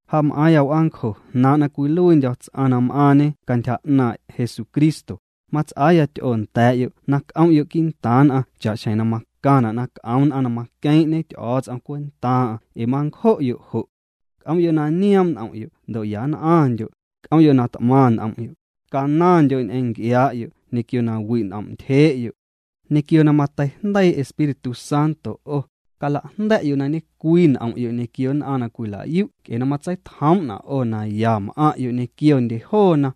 Ja m'aaⁿya w'aancjo jnaaⁿ' na cwiluiindyo̱ ts'aⁿ na m'aaⁿñe cantyja 'naaⁿ' Jesucristo, mats'aaya ty'oo nda̱a̱'yo' na c'om'yo' quii'ntaaⁿ nn'aⁿ cha'xjeⁿ na macaⁿna' na c'om nn'aⁿ na maqueeⁿ'ñe Ty'o̱o̱ts'om cwentaaⁿ'aⁿ ee mancjo'yo' jo'. C'om'yo' na nioom' n'om'yo' ndo' yann'aⁿndyo', c'om'yo' na t'maⁿ n'om'yo', canaⁿndyo' ñ'eⁿ nc'iaa'yo' ñequio na wi' n'om'ntyjee'yo'. Ñequio na mateijndeii Espíritu Santo 'o, calajnda̱'yo' na ñecwii n'om'yo' ñequio nn'aⁿ na cwila'yu' nc'e na matseitjoom'na' 'o na ya m'aⁿ'yo' ñequiondye joona.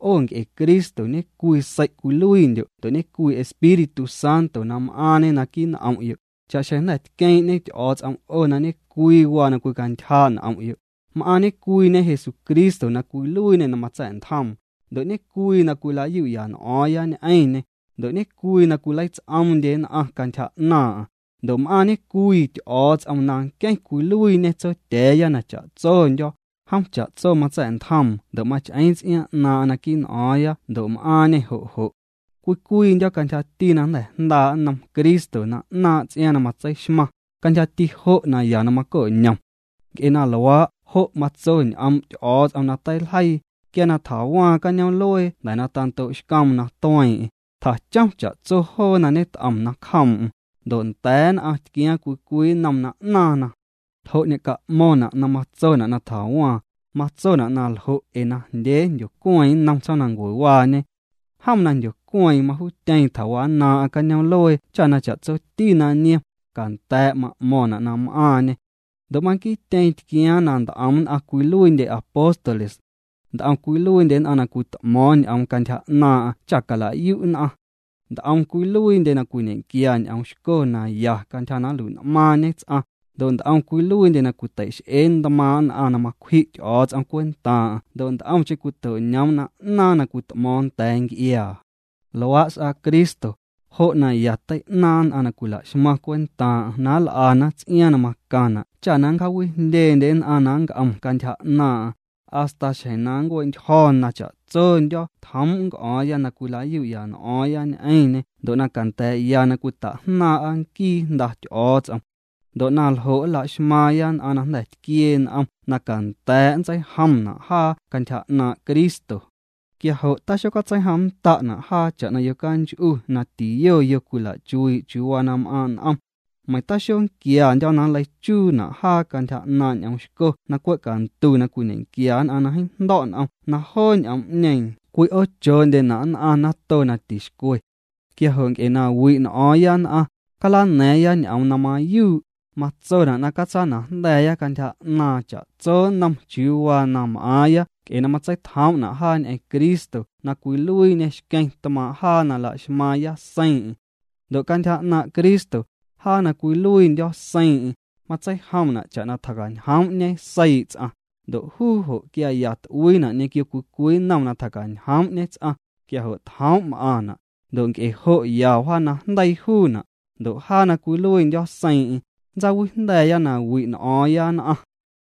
'O nc'e Cristo ñecwii sei' cwiluiindyo' ndo' ñecwii Espíritu Santo na m'aaⁿñê naquii' n'om'yo', cha'xjeⁿ jnda̱ tqueeⁿ'ñe Ty'o̱o̱ts'om 'o na ñecwii waa na cwicantyjaa' n'om'yo', m'aaⁿ ñecwiiñe Jesucristo na cwiluiiñê na matsa̱'ntjoom, ndo' ñecwii na cwila'yu'ya n'o̱o̱ⁿya ñ'eⁿñê, ndo' ñe'cwii na cwileits'oomndye nn'aⁿ cantyja 'naaⁿ'aⁿ, ndo' m'aaⁿ ñecwii Ty'o̱o̱ts'om na nqueⁿ cwiluiiñe Tsotya̱a̱ya na cha'tsondyo̱, jom cha'tso matsa̱'ntjoom ndo' mach'eeⁿ ts'iaaⁿ 'naaⁿ'aⁿ naquii' n'o̱o̱ⁿya ndo' m'aaⁿñê jo' jo'. Cwii cwiindyo̱ cantyjati na jnda̱ jndaa' nnom Cristo na 'naaⁿ' ts'iaaⁿ na matseixmaⁿ, cantyjati jo' naya na maco'ñom. Nc'e na luaa' jo' matso ñ'oom' Ty'o̱o̱ts'om na teiljeii: Quia na tjawaaⁿ cañoom'luee jnda̱ na tando'xcoom na tueeⁿ'eⁿ, tjachom cha'tso joo na ñet'om nacjoom'm, ndo' nda̱a̱ nn'aⁿ tquiaaⁿ cwii cwii nnom na 'naaⁿna. ¿Ljo' ñe'ca'mo̱ⁿna' na matsona' na tjawaaⁿ? Matsona' naljo' ee najndyee jndyocueeⁿ nnom tsjoomnancuewaañe. Jom na jndyocueeⁿ majuutyeeⁿ tjawannaaⁿ'aⁿ cañoom'luee cha na cha'tsoti na niom, canda̱a̱' ma'mo̱ⁿna' na m'aaⁿñê. Ndo' manquiityeeⁿ tquiaaⁿ na nt'om nn'aⁿ cwiluiindye apóstoles. Nt'om cwiluiindye nn'aⁿ na cwit'mo̱o̱ⁿ ñ'oom cantyja 'naaⁿ'aⁿ cha cala'yu' nn'aⁿ. Nt'om cwiluiindye na cwiñe'quia ñ'oom xco na ya cantyja na nlui'n'maaⁿñe ts'aⁿ, ndo' nt'om cwiluiindye na cwitei'x'ee ntmaaⁿ' nn'aⁿ na macwji' Ty'o̱o̱ts'om cwentaaⁿ'aⁿ ndo' nt'omcheⁿ cwito'ñoom na 'naaⁿ na cwit'mo̱o̱ⁿ nda̱a̱ nc'iaa. Luaa' s'aa Cristo, jo' na ya tei'naaⁿ nn'aⁿ na cwila'xmaⁿ cwentaaⁿ'aⁿ na nl'ana ts'iaaⁿ na macaⁿna' cha na nncjaawijndyeendye nn'aⁿ na nnc'om cantyja 'naaⁿ'aⁿ, hasta xjeⁿ na nncue'ntyjo̱ na cha'tsondyo̱ tjoom' nnc'o̱o̱ⁿya na cwila'yu'ya n'o̱o̱ⁿya ñ'eⁿñê ndo' na canda̱a̱'ya na cwita'jnaaⁿ'a nquii Jnda Ty'o̱o̱ts'om. Ndo' na ljo' nlaxmaaⁿya nn'aⁿ na jnda̱ tquiee n'om na canda̱a̱' nntseijomna' jaa cantyja 'naaⁿ' Cristo. Quia jo' taxocatseijomnnda'na' jaa cha'na yocanch'u na tiyo yo cwila'chuii' chiuu waa na m'aaⁿ' n'om. Meiⁿ taxonquiandyo̱ na nleichuuna' jaa cantyja 'naaⁿ' ñ'oom xco na cwe' cantu na cwiñe'quia nn'aⁿ na jeeⁿ jndo̱' n'om na joo ñ'oom'ñeeⁿ cwi'oochoondyena' nn'aⁿ nato na tixcwe. Quia jo' nc'e na wi' n'o̱o̱ⁿya nn'aⁿ, calana̱a̱ⁿya ñ'oom na mayuu', matsona' na catsanajnda̱a̱ya cantyja 'naaⁿ cha'tso nnom chiuu waa na m'aaⁿya nc'e na matseitjoom'na' jaa ñ'eⁿ Cristo na cwiluiiñê xqueⁿ tmaaⁿ' jaa na laxmaaⁿya seiiⁿ'eⁿ. Ndo' cantyja 'naaⁿ' Cristo, jaa na cwiluiindyo̱ seiiⁿ'eⁿ, matseijomna' cha'na tjacañjoom'ñe seii' ts'aⁿ, ndo' juu jo' quia ya t'uii'na' ñequio cwii cwii nnom na tjacañjoom'ñe ts'aⁿ, quia jo' tjoom' m'aaⁿna', ndo' nc'e jo' ya wjanajndeii juuna'. Ndo' jaa na cwiluiindyo̱ seiiⁿ'eⁿ, nntsawijnda̱a̱ya na wi' n'o̱o̱ⁿya nn'aⁿ.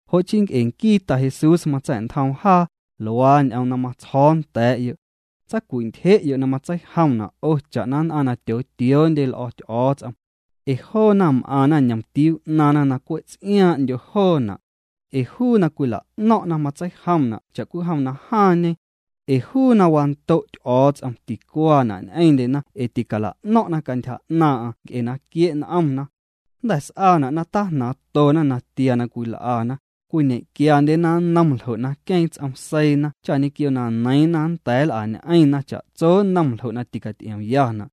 Jo' chii nc'e nquii Ta Jesús matsa̱'ntjoom jaa, luaa ñ'oom na matsjo̱o̱ nda̱a̱'yo'. Tsacwi'ntyje'yo' na matseijomna' 'o cha'na nn'aⁿ na tyootioondye l'o̱ Ty'o̱o̱ts'om. Ee joona m'aⁿna ñomtiuu 'naaⁿna na cwe' ts'iaaⁿ'ndyo joona'. Ee juu na cwila'no̱ⁿ'na matseijomna' cha'cwijom na jaaⁿñe. Ee juu na wando' Ty'o̱o̱ts'om ticuaana' ñ'eⁿndyena ee ticala'no̱ⁿ'na cantyja 'naaⁿ'aⁿ nc'e na quie' n'omna. Jnda̱ s'aana' na tajnaaⁿtona natia na cwil'ana, cwiñequiandyena nnom ljo' na queeⁿ ts'om seiina cha ñequio na neiiⁿna nnda̱a̱ nl'añ'eⁿna cha'tso nnom ljo' na ticaty'iomyana'.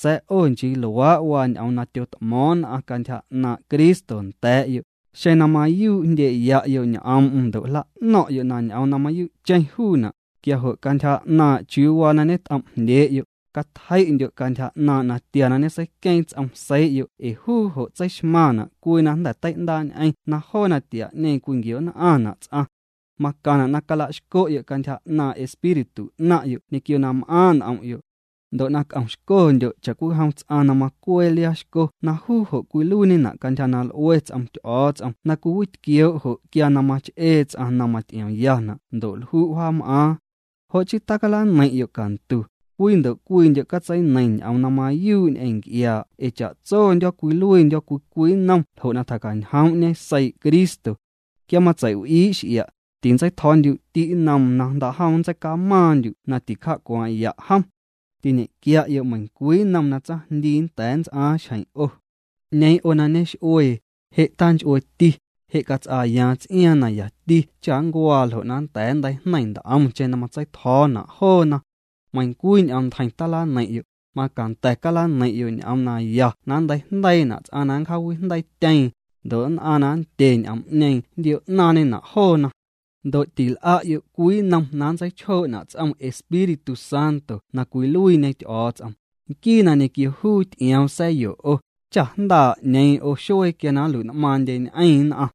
Sa̱a̱ 'o nchii luaa' waa ñ'oom na tyot'mo̱o̱ⁿ nn'aⁿ cantyja 'naaⁿ' Cristo nda̱a̱'yo', xeⁿ na mayuu' jndye'ya'yo' ñ'oom'm ndo' jla'no̱ⁿ'yo' na ñ'oom na mayu'cheⁿ juuna', quia jo' cantyja 'naaⁿ' chiuu waa na ñet'om'jndyee'yo', catjei'ndyo' cantyja 'naaⁿ' natia na ñeseiqueeⁿ ts'om seii'yo' ee juu jo' tseixmaⁿna' cwii na jnda̱ tei'ndaa'ñ'eⁿ na joo natia'ñeeⁿ cwinquio'nn'aⁿna' ts'aⁿ. Macaⁿna' na cala'xco'yo' cantyja 'naaⁿ' espíritu 'naⁿ'yo' ñequio na m'aaⁿ' n'om'yo', ndo' na c'omxcondyo' cha'cwijom ts'aⁿ na macwee liaa xco na juu jo' cwiluiiñena' cantyja na l'ue ts'om Ty'o̱o̱ts'om na cwiwitquioo' jo' quia na mach'ee ts'aⁿ na maty'iomyana' ndo' lju' wjaam'aaⁿ. Jo' chii tacalaneiⁿ'yo' cantu, cwii ndo' cwiindyo' catseineiⁿ ñ'oom na mayuu' ñ'eⁿ nc'iaa' ee cha'tsondyo̱ cwiluiindyo̱ cwii cwii nnom ljo' na tjacañjoom'ñe seii' Cristo. Quia matsei'w'ii' x'ia', tintseitjo̱o̱ndyu'ti' nnoom na jndaa'jom nntseicamaaⁿndyu' na tincja'cwaaⁿ'ya' jom. Tiñenquia'yo' meiⁿcwii nnom na tsaⁿjndii nnda̱a̱ nnts'aaⁿ xjeⁿ 'o. 'Ñeeⁿ 'o na ñex'uee, je' tanch'ueeti, je' cats'aayaaⁿ ts'iaaⁿ na yati cha nncuaa ljo' na nnda̱a̱ nnteijneiⁿ nt'omcheⁿ na matseitjo̱o̱na' joona. Meiⁿcwii ñ'oomntjeiⁿ talaneiⁿ'yo', macanda̱ calaneiⁿyo' ñ'oom naya na nnteijndeiina' ts'aⁿ na nncjaawijndeiityeeⁿ, ndo' nn'aⁿ na nndye ñ'oom'ñeeⁿ nntio'naaⁿñena' joona. Ndo' til'a'yo' cwii nnom na nntseichjoo'na' ts'om Espíritu Santo na cwiluiiñe Ty'o̱o̱ts'om, nquii na ñequio juu ty'ioom sa̱yo 'o, cha jndaa' 'ñeeⁿ 'o xuee quia na nnlui'n'maaⁿndyeñ'eⁿ nn'aⁿ.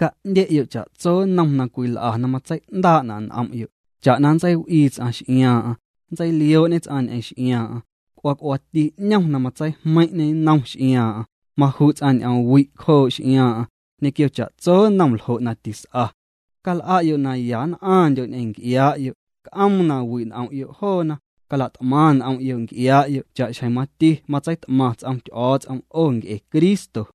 Ca'ndye'yo' cha'tso nnom na cwil'a na matsei'ndaa'na' n'om'yo', cha'na nntseiw'ii ts'aⁿ x'iaaⁿ'aⁿ, nntseilioo'ñe ts'aⁿ ñ'eⁿ x'iaaⁿ'aⁿ, c'uaa c'uaati 'ñom na matseijmeiⁿ'ñê nnom x'iaaⁿ'aⁿ, maju' ts'aⁿ ñ'oom wi' nacjoo' x'iaaⁿ'aⁿ, ñequio chatso nnom ljo' na tis'a. Cal'a'yo' na ya nn'aⁿndyo' ñ'eⁿ nc'iaa'yo', c'oom na wi' n'om'yo' joona, cala't'maⁿ n'om'yo' nc'iaa'yo' cha'xjeⁿ mati matseit'maⁿ ts'om Ty'o̱o̱ts'om 'o nc'e Cristo.